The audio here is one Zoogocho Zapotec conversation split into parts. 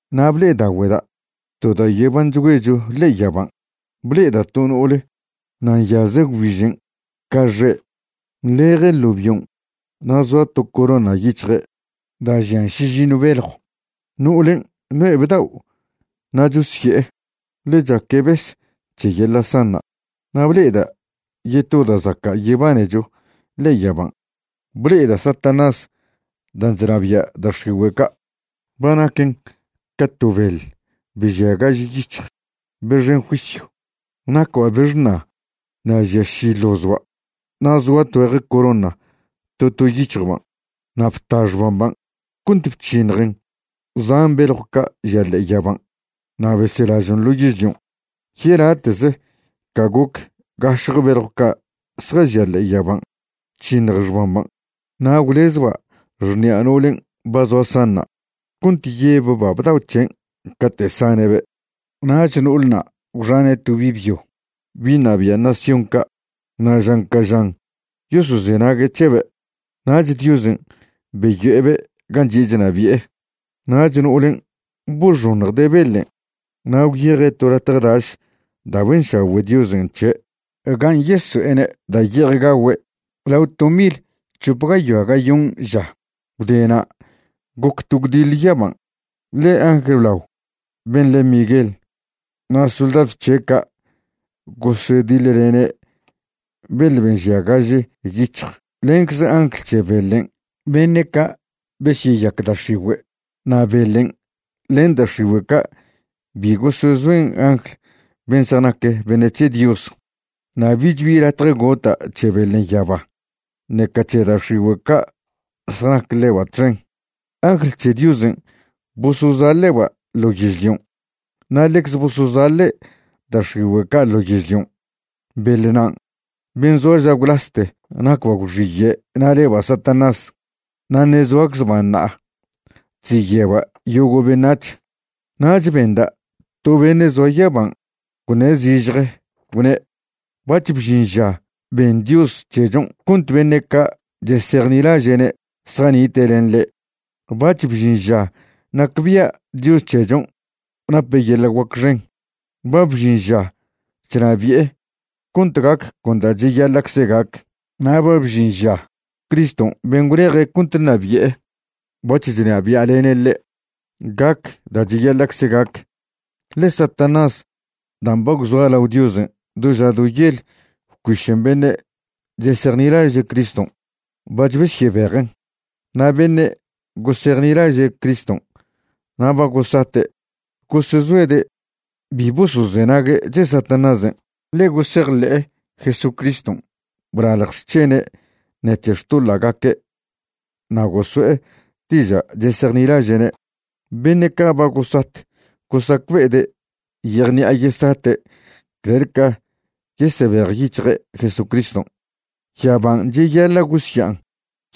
Na' ble'edaogüeda' to da' yebanchgüecho ḻe'e yaban', ble'eda' to no'ole na' nyaze' gwbižen' ca xe'. Nḻeje' ḻo bion' na' zoa to corona yic̱hje' da' žian šižiṉw beljw. No'olen' no'e bdao' na' chosye'e, ḻe chaque' bes c̱he yeḻa' sanṉa'. Na' ble'eda' yeto da' zaca' yebanecho ḻe'e yaban', ble'eda' Satanás dan' chnabia' da' x̱igüe' ca', ba naquen ca to beḻ be žia gaž yic̱hj, be xen juisyw. Nacba' be xṉa na' žia ši ḻozba' na' zoa tgüeje corona to to yic̱hjban'. Na' bta xbamban' cont bc̱hiṉjen zan beljw ca' žia ḻe'e yaban' na' beselažon' ḻo yežlion', yelate'ze ca goc gašje beḻjw ca' zjažia ḻe'e yaban' bc̱hiṉj xbamban'. Na' gwlezba' xṉi'a no'olen' ba zoa sanṉa' cont yebba' bdao' c̱hen' cate' sane'be'. Nach no'olna' gwxane' to bi' byo bi' ṉabia' nación ca' na' žan ca žan yosozenague' c̱hebe'. Nach Diosen' beyo'ebe' gan' chi'e chnabi'e. Nach no'olen' boxoṉjde' beḻen', na' gwyeje' to latje daš da' benšagüe' Diosen' c̱he', gan' yeso'ene' da' ye'ej gagüe' lao to mil c̱hop gayoa gayon ža. Gwde na' goc to gwdiḻe yaban', ḻe angl blao ben' le' Miguel na' soldadw c̱he' ca' gosediḻlene' beḻ ben' žia gaž yic̱hj lencze angl c̱he beḻen' beṉe' ca' besyeyac da' x̱igüe'. Na' beḻen' len da' x̱igüe' ca' bi gosezoen angl ben' zjanac beṉe' c̱he Dios, na' bich bi latje gota' c̱he beḻen' yaba, ṉeca c̱he da' x̱igüe' ca' zjanac ḻeba' txen. Angl c̱he Diosen' bosozaḻe'ba' ḻo yežlion'. Na' ḻecze bosozaḻe' da' x̱igüe' ca' ḻo yežlion'. Beḻnan' ben' zoa ža gwlaste nacba' gwxiye' na' leba' Satanás, na' ṉe' zoaczba' ṉa'a chziye'ba' yogo' beṉac̱h. Nach benda' to beṉe' zoa yaban' gwṉe' zižje gwne': ―Bac̱h bžin ža ben Dios c̱hechon' cont beṉe' ca' chesejnilaže'ne' zjanite' len ḻe'. Bac̱h bžin ža nacbia' Dios c̱hechon' nape' yeḻa' guac xen. Ba bžin ža chnabi'e cont gac con da' cheyaḻa'cze gac. Na' ba bžin ža Criston' ben' gwleje' cont ṉabi'e bac̱h chnabia'lene' ḻe'. Gac da' cheyaḻa'cze gac, ḻe Satanás dan' ba gwzoa lao Diosen' do ža do yel bcuišen beṉe' chesejnilaže' Criston', bac̱h besyebejen'. Na' beṉe' gosejnilaže' Criston' na' ba gosate', gosezoede' bi bosozenague' c̱he Satanásen', ḻe gosejḻe'e Jesucriston' blalj xc̱hene' ṉec̱he xtoḻa'gaque' na' goso'e diža' chesejnilaže'ne'. Beṉe' ca' ba gosat gosacbe'ede' yejṉi'a yesate' clel ca yesebejyic̱hje' Jesucriston'. Yaban' cheyaḻa' gosya'an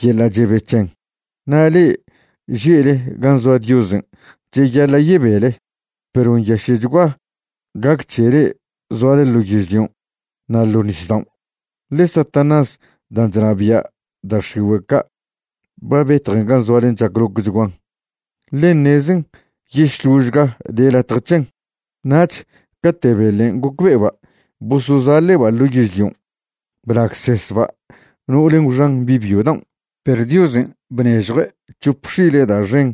yeḻa' chebe c̱hen, na' le'e že'le gan' zoa Diosen' cheyaḻa' yebele, perw nyaše'chgua gac c̱he le'e zoale ḻo yežlion' na' ḻo' nisdaon', ḻe Satanás dan' chnabia' da' x̱igüe' ca' ba betjen gan' zoalen' chaclocchguan, ḻe ṉezen yešložga de latj c̱hen. Nach cate' beḻen' gocbe'eba' bosozaḻe'ba' ḻo yežlion', blagsesba' no'olen' gwxan bi' byo daon'. Perw Diosen' bnežjue' c̱hop x̱ile' da' xen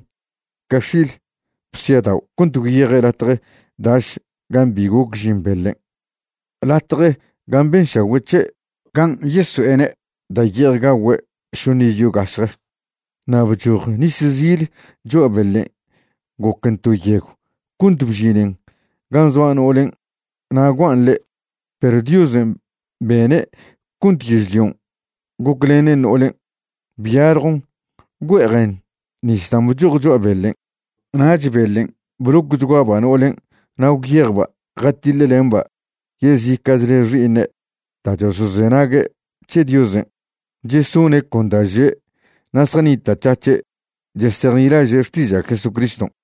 ca x̱il bsiadao' cont gwyeje' latje daš gan' bi goc žin beḻen', latje gan' benšagüe' c̱he' gan' yeso'ene' da' ye'ej gagüe' šoṉ iz yo gašje. Na' bchoj nis zil cho'a beḻen' goquen to yegw cont bžinen gan' zoa no'olen' na' guan' ḻe'. Perw Diosen' bene' cont yežlion' goclenen no'olen', byaljon güe'ejen nis dan' bchoj cho'a beḻen'. Nach beḻen' blocchguaba' no'olen' na' gwyejba' jatiḻlemba' yezica'chle xi'iṉe' da' chosozenague' c̱he Diosen', chesone' con da' že' na' zjanita'c̱hac̱he' chesejnilaže' xtiža' Jesucriston'.